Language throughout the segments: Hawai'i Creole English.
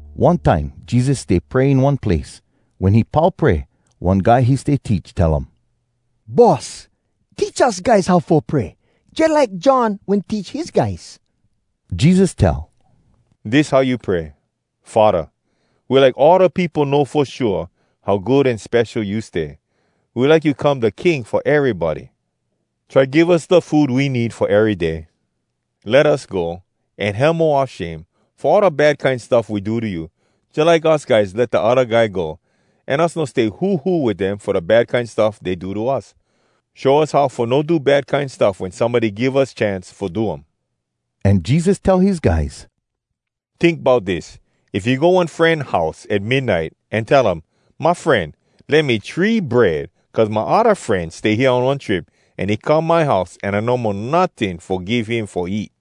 One time Jesus stay pray in one place. Wen he pau pray, one guy he stay teach tell um, “Boss, teach us guys how fo pray, jalike John wen teach his guys.” Jesus tell, “Dis how you pray: “‘Faddah, We like all da peopo know fo shua How good an spesho you stay. We like you come da king fo erybody. Try give us da food we need fo ery day. Let us go, an hemo oua shame Fo all da bad kine stuff we do to you, Jalike us guys let da odda guy go, An us no stay huhu wit dem Fo da bad kine stuff dey do to us. Show us how fo no do bad kine stuff Wen somebody give us chance fo do um.’” An Jesus tell his guys, “Tink bout dis! If you go one fren house at midnite an tell um, ‘My fren, lend me three bread, cuz my odda fren stay hea on one trip, an he come my house, an I no mo notting fo give him fo eat.’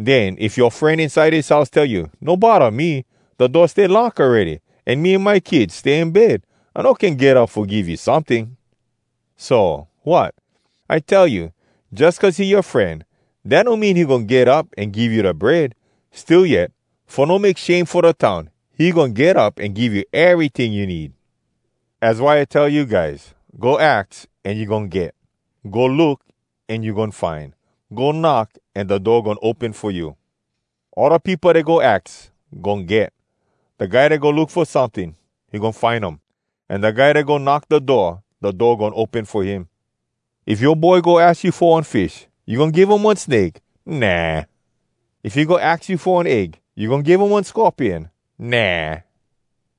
Den if yoa fren inside his house tell you, ‘No bodda me! Da door stay lock awready, an me an my kids stay in bed. I no can get up fo give you someting.’ So, wat? I tell you, jus cuz he yoa fren, dat no mean he goin get up an give you da bread. Still yet, fo no make shame fo da town, he goin get up an give you eryting you need. Az why I tell you guys: Go aks, an you goin get. Go look, an you goin find. Go knock, an da door goin open fo you. All da peopo dat go aks, goin get. Da guy dat go look fo someting, he goin find um. An da guy dat go knock da door, da door goin open fo him. If yoa boy go aks you fo one fish, you goin give um one snake? Nah! If he go aks you fo one egg, you goin give um one scorpion? Nah!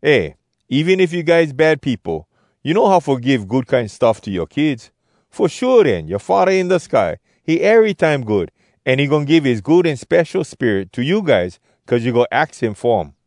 Eh, even if you guys bad peopo, you know how fo give good kine stuff to yoa kids. Fo shua den, yoa Faddah inside da sky, he erytime good, an he goin give his Good An Spesho Spirit to you guys cuz you go aks him fo um.”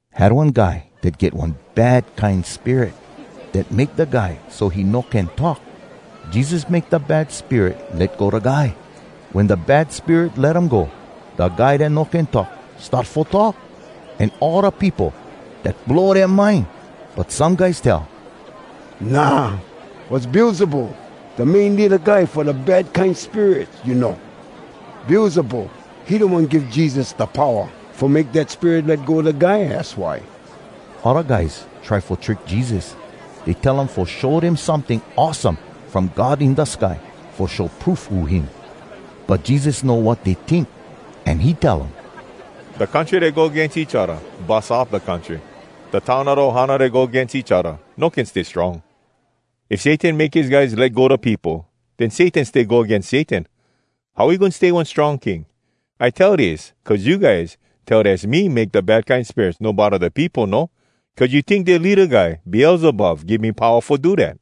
Had one guy dat get one bad kine spirit, dat make da guy so he no can talk. Jesus make da bad spirit let go da guy. Wen da bad spirit let um go, da guy dat no can talk, start fo talk. An all da peopo, dat blow dea mind. But some guys tell, “Nah! Was Beelzebul, da main leada guy fo da bad kine spirits, you know. Beelzebul, he da one give Jesus da powa fo make dat spirit let go da guy, az why!” Odda guys try fo trick Jesus. Dey tell um fo show dem someting awesome from God in da sky fo show proof who him. But Jesus know wat dey tink, an he tell um, “Da country dat go agains each odda, bus up da country. Da town o da ohana dat go agains each odda, no can stay strong. If Satan make his guys let go da peopo, den Satan stay go agains Satan. How he goin stay one strong king? I tell dis cuz you guys tell dass me make da bad kine spirits no bodda da peopo no, cuz you tink dea leada guy Beelzebul give me powa fo do dat.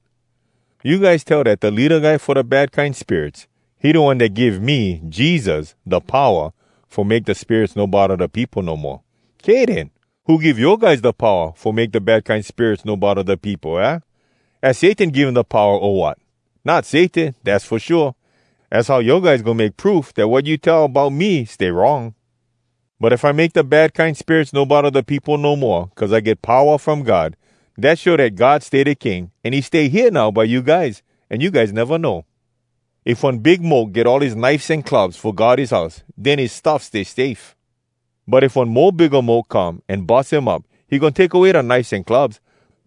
You guys tell dat da leada guy fo da bad kine spirits, he da one dat give me Jesus da powa fo make da spirits no bodda da peopo no moa. Kay den. Who give yoa guys da powa fo make da bad kine spirits no bodda da peopo, aah? Az Satan give dem da powa, o wat? Not Satan, dass fo shua. Az how yoa guys goin make proof dat wat you tell bout me stay wrong. But if I make da bad kine spirits no bodda da peopo no moa cuz I get powa from God, dat show dat God stay da king, an he stay hea now by you guys, an you guys neva know. “If one big moke get all his knifes an clubs fo guard his house, den his stuffs stay safe. But if one mo bigga moke come, an bus him up, he goin take away da knifes an clubs.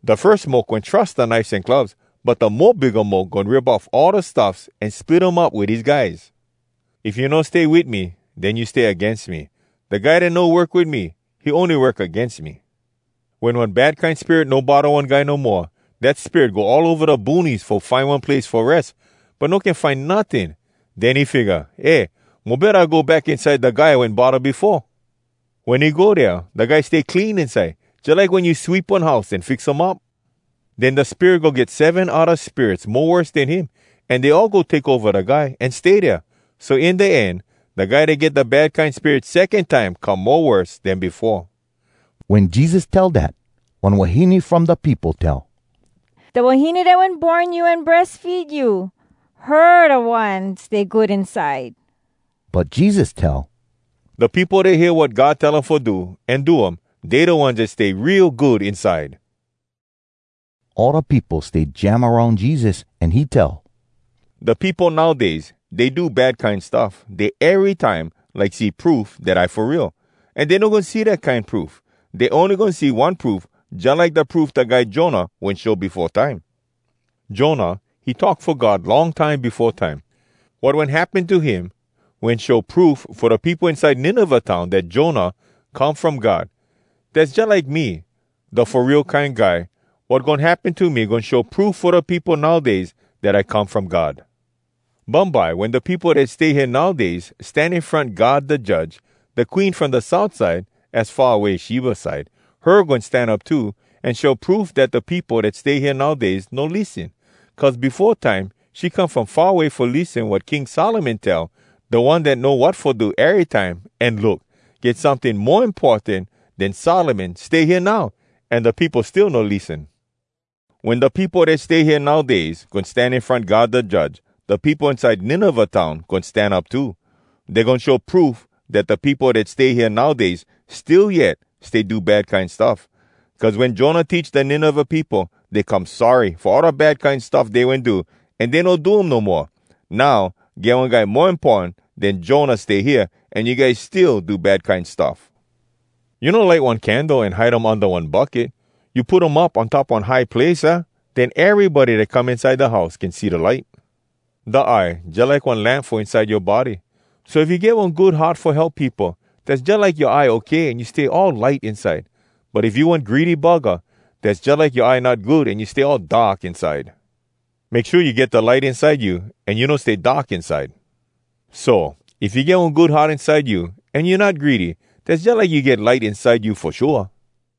Da firs moke wen trus da knifes an clubs, but da mo bigga moke goin rip off all da stuffs, an split um up wit his guys. “If you no stay wit me, den you stay agains me. Da guy dat no work wit me, he ony work agains me.” “Wen one bad kine spirit no bodda one guy no moa, dat spirit go all ova da boonies fo find one place fo res, but no can find notting. Den he figga, ‘Eh, mo betta I go back inside da guy I wen bodda befoa.’ Wen he go dea, da guy stay clean inside, jalike wen you sweep one house an fix um up. Den da spirit go get seven odda spirits mo worse den him, an dey all go take ova da guy, an stay dea. So in da end, da guy dat get da bad kine spirit secon time come mo worse den befoa.” Wen Jesus tell dat, one wahine from da peopo tell, “Da wahine dat wen born you an breas feed you, her da one stay good inside!” But Jesus tell, “Da peopo dat hear wat God tell um fo do, an do um, dey da ones dat stay real good inside!” All da peopo stay jam aroun Jesus, an he tell, “Da peopo nowdays, dey do bad kine stuff. Dey erytime like see proof dat I fo real. An dey no goin see dat kine proof. Dey ony goin see one proof jalike da proof da guy Jonah wen show befo time. Jonah, he talk fo God long time befo time. Wat wen happen to him, wen show proof fo da peopo inside Nineveh town dat Jonah come from God. Dass jalike me, da Fo Real Kine Guy. Wat goin happen to me goin show proof fo da peopo nowdays dat I come from God. Bumbye wen da peopo dat stay hea nowdays stan in front God da Judge, da Queen from da south side, az far away Sheba side, her goin stan up too, an show proof dat da peopo dat stay hea nowdays no lissen. Cuz befo time she come from far away fo lissen wat King Solomon tell, da one dat know wat fo do erytime. An look! Get someting mo importan den Solomon stay hea now, an da peopo still no lissen! Wen da peopo dat stay hea nowdays goin stan in front God da Judge, da peopo inside Nineveh town goin stan up too. Dey goin show proof dat da peopo dat stay hea nowdays still yet stay do bad kine stuff. Cuz wen Jonah teach da Nineveh peopo, dey come sorry fo all da bad kine stuff dey wen do, an dey no do um no moa. Now get one guy mo importan den Jonah stay hea, an you guys still do bad kine stuff!” “You no light one candle an hide um unda one bucket. You put um up on top one high place, aah? Den erybody dat come inside da house can see da light. Da eye jalike one lamp fo inside yoa body. So if you get one good heart fo help peopo, dass jalike yoa eye okay an you stay all light inside. But if you one greedy buggah, dass jalike yoa eye not good an you stay all dark inside! Make shua you get da light inside you, an you no stay dark inside. So, if you get one good heart inside you, an you not greedy, dass jalike you get light inside you fo shua!”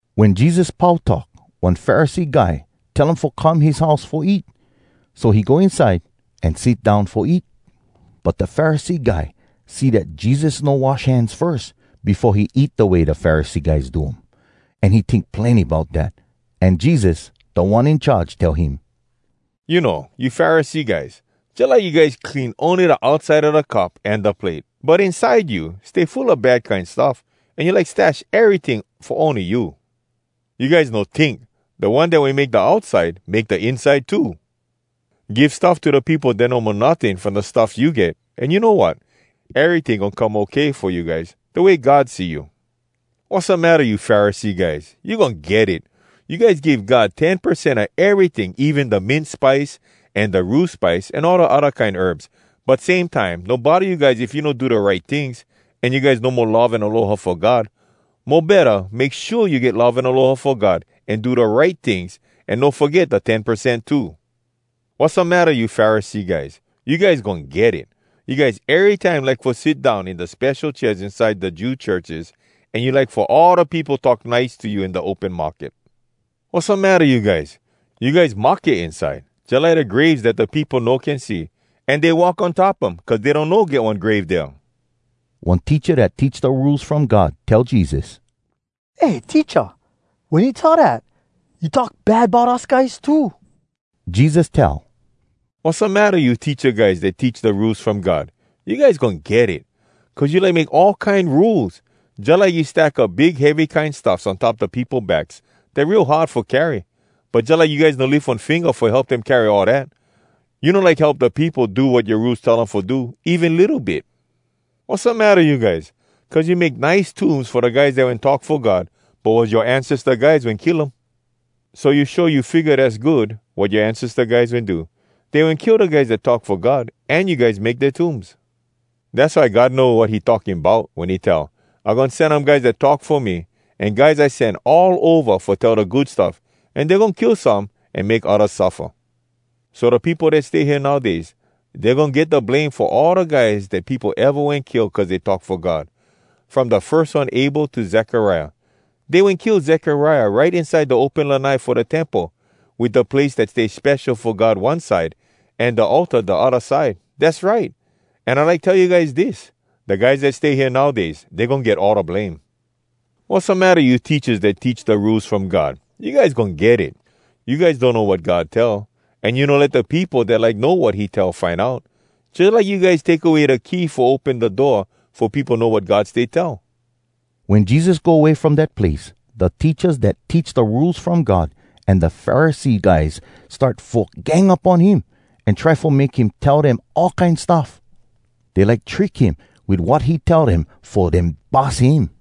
Wen Jesus pau talk, one Pharisee guy tell um fo come his house fo eat. So he go inside, an sit down fo eat. But da Pharisee guy see dat Jesus no wash hands firs befo he eat da way da Pharisee guys do um, an he tink plenny bout dat. An Jesus, Da One In Charge, tell him, “You know, you Pharisee guys, jalike you guys clean ony da outside a da cup an da plate. But inside you, stay full a bad kine stuff, an you like stash eryting fo ony you! You guys no tink! Da One dat wen make da outside, make da inside too! Give stuff to da peopo dat no mo notting from da stuffs you get, an you know wat? Eryting goin come okay fo you guys, da way God see you. “Wassamatta you Pharisee guys?! You goin get it! You guys give God ten percent a eryting, even da mint spice an da rue spice, an all da odda kine herbs. But same time, no bodda you guys if you no do da right tings, an you guys no mo love an aloha fo God. Mo betta, make shua you get love an aloha fo God, an do da right tings, an no foget da ten percent too. “Wassamatta you Pharisee guys?! You guys goin get it! You guys erytime like fo sit down in da spesho chairs inside da Jew churches, an you like fo all da peopo talk nice to you in da open market. “Wassamatta you guys?! You guys mahke inside, jalike da graves dat da peopo no can see. An dey walk on top um cuz dey donno get one grave dea.” One teacha dat teach da Rules From God tell Jesus, “Eh Teacha, wen you tell dat, you talk bad bout us guys too.” Jesus tell, “Wassamatta you teacha guys dat teach da Rules From God?! You guys goin get it! Cuz you like make all kine rules! Jalike you stack up big heavy kine stuffs on top da peopo backs, dat real hard fo carry. But jalike you guys no lif one finga fo help dem carry all dat—you no like help da peopo do wat yoa rules tell um fo do, even litto bit. “Wassamatta you guys?! Cuz you make nice tombs fo da guys dat wen talk fo God, but was yoa ancesta guys wen kill um. So you show you figga dass good, wat yoa ancesta guys wen do. Dey wen kill da guys dat talk fo God, an you guys make dea tombs! Dass why God know wat he talking bout wen he tell, ‘I goin sen um guys dat talk fo me, an guys I sen all ova fo tell da Good Stuff, an dey goin kill some, an make oddas suffa.’ So da peopo dat stay hea nowdays, dey goin get da blame fo all da guys dat peopo eva wen kill cuz dey talk fo God, from da firs one Abel to Zekariah. Dey wen kill Zekariah right inside da open lanai fo da Temple, wit da place dat stay spesho fo God one side, an da altar da odda side. Dass right! An I like tell you guys dis: Da guys dat stay hea nowdays, dey goin get all da blame. “Wassamatta you teachas dat teach da Rules From God?! You guys goin get it! You guys donno wat God tell, an you no let da peopo dat like know wat he tell find out. Jalike you guys take away da key fo open da door fo peopo know wat God stay tell!” Wen Jesus go way from dat place, da teachas dat teach da Rules From God an da Pharisee guys start fo gang up on him, an try fo make him tell dem all kine stuff. Dey like trick him wit wat he tell dem fo dem bus him.